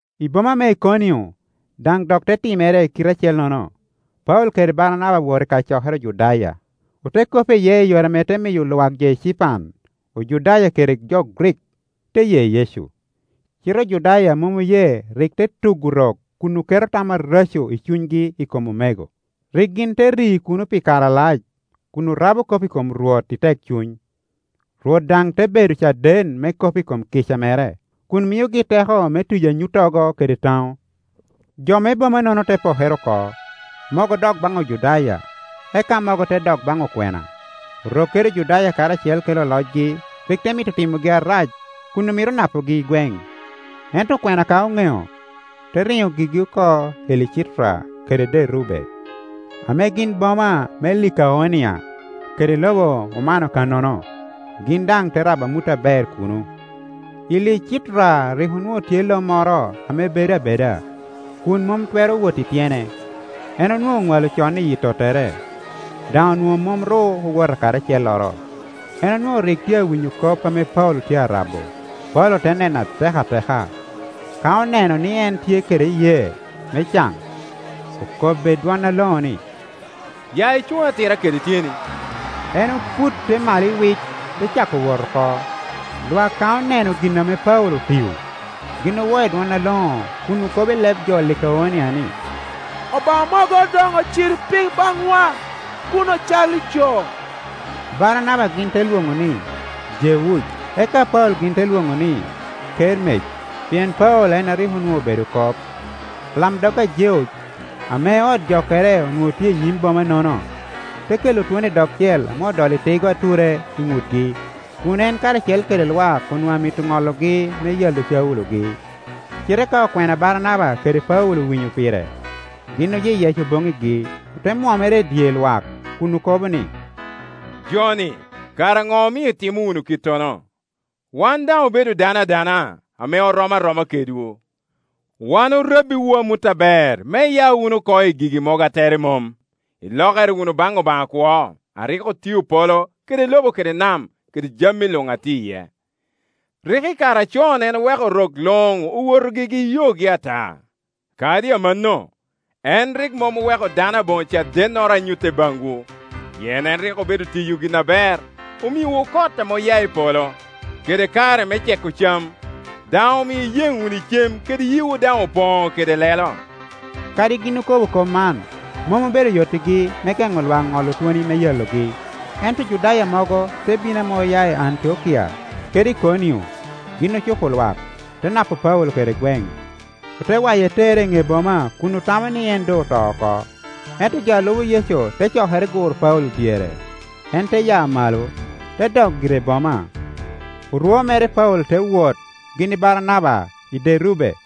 I boma me Ikonio daŋ dok te timere i kite acellono. Paulo kede Baranaba owoto i kacokere Ojudaya, ote kop iye i yore ame te miyo lwak jo ecipan, Ojudaya kede jo Grik, te ye Yecu. Cite Ojudaya a mom oye rik te tugo Orok kun oketo tam areco i cunygi i kom omego. Rik gin te ri kuno pi kare alac, kun orabo kop i kom Rwot i tekcuny, Rwot daŋ te bedo caden me kop i kom kica mere, kun miogi teko me tiyo anyuttogo kede taŋo. Jo me bomanono te pokere oko; mogo odok baŋ Ojudaya, eka mogo te dok baŋ okwena. Orok kede Ojudaya karacel kede olocgi rik te mito timogi arac kun omito napogi i gweŋ, ento okwena ka oŋeo, te riŋo gigi oko i Licitra kede Derube, ame gin boma me Likaonia, kede i lobo omano kannono. Gin daŋ te rabo amut aber kuno. I Licitra rik onwoŋo tye iye lo moro ame bedo abeda, kun mom twero wot i tyene; en onwoŋo oŋwalo con i yi tottere, daŋ onwoŋo mom ru owoto kadi acelloro. En onwoŋo rik tye awinyo kop ame Paulo tye arabo. Paulo te nene atek ateka; ka oneno ni en tye kede iyee me caŋ, okobbe i dwon aloŋo ni, “Ya icuŋ atira kede tyeni.” En oputte malo iwic, te cako wot oko. Lwak ka oneno gin ame Paulo otio, gin owo i dwon aloŋo kun okobo i leb jo Likaonia ni, “Obaŋa mogo doŋ ociro piny baŋwa, kun ocalli jo!” Baranaba gin te lwoŋo ni, Jeuc, eka Paulo gin te lwoŋo ni, Kermec, pien Paulo en a rik onwoŋo obedo kop. Alamdog a Jeuc, ame ot jokkere onwoŋo tye i nyim boma-nono, te kelo twoni i dogcel ame odolo tigo ature i ŋutgi, kun en karacel kede lwak onwoŋo amito ŋologi me yalo Caulo-gi. Cite ka okwena Baranaba kede Paulo owinyo pire, gin oyeyeco boŋŋigi, ote mwomere i dye lwak kun okobo ni, “Jo-ni, kara Ŋo omio itimo wunu kittono? Wan, daŋ obedo dano adana, ame rom aroma kedwu. Wan orabbiwu amut aber me iya wunu oko i gigi mogo a tere mom, ilokere wunu baŋ Obaŋa akwo a rik otio polo kede lobo kede nam kede jami luŋ a tye iye. Rik i kare acon en oweko rok luŋ owoto gigi i yogi ata; kadi amanno, en rik mom oweko dano aboŋo cadennoro a nyute baŋwu. Pien en rik obedo tiyo gin aber, omiowu kot ame oya i polo, kede kare me ceko cam, daŋ omio iyen wunu i cem kede yiwu daŋ opoŋo kede lelo.” Kadi gin okobo kop man, mom obedo yottigi me geŋo lwak ŋolo twoni me yalogi. Ento Ojudaya mogo te bino ame oya i Antiokia kede i Ikonio; gin ocupo lwak te napo Paulo kede gweŋ, ote waye tere i ne boma kun otamo ni en doŋ oto oko. Ento jo a lubo Yecu te cokere guro Paulo dyere, en te ya malo, te dok gire i boma. Orwo mere Paulo te wot gin i Baranaba i Derube.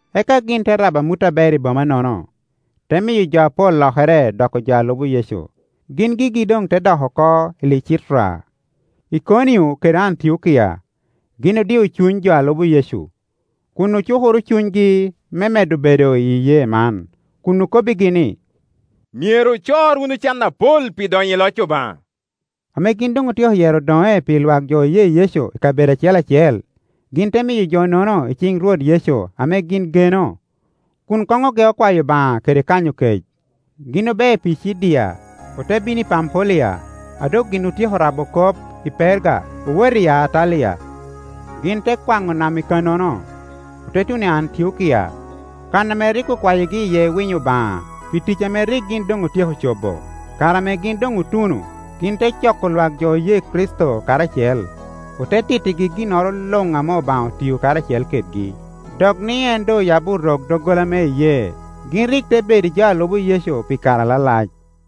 Eka gin te rabo amut aber i boma-nono, te miyo jo apol lokere doko jo a lubo Yecu; gin gigi doŋ te dok oko i Licitra, lkonio kede Antiokia. Gin odio cuny jo a lubo Yecu, kun ocukoro cunygi me medde bedo iyi iyee man, kun okobbigi ni, “Myero ocor wunu can apol pi donyo i loc Obaŋa.” Ame gin doŋ otyeko yero odoŋe pi lwak jo oye Yecu i kabedo acel acel, gin te miyo jo-nono i ciŋ Rwot Yecu ame gin geno, kun koŋ ogeo kwayo Obaŋa kede kanyo kec. Gin obeo i Picidia, ote bino i Pampulia. A doŋ gin otyeko rabo kop i Perga, owoto i Attalia. Gin te kwaŋo nam i kannono, ote tuno i Antiokia, kan ame rik okwayigi iye winyo Obaŋa pi tic ame rik gin doŋ otyeko cobo. Kare ame gin doŋ otuno, gin te coko lwak jo oye Kricito karacel, ote tittigi ginnoro luŋ ame Obaŋa otio karacel kedgi, dok ni en doŋ oyabbi Orok doggola me iyee. Gin rik te bedo i jo a lubo Yecu pi kare alalac.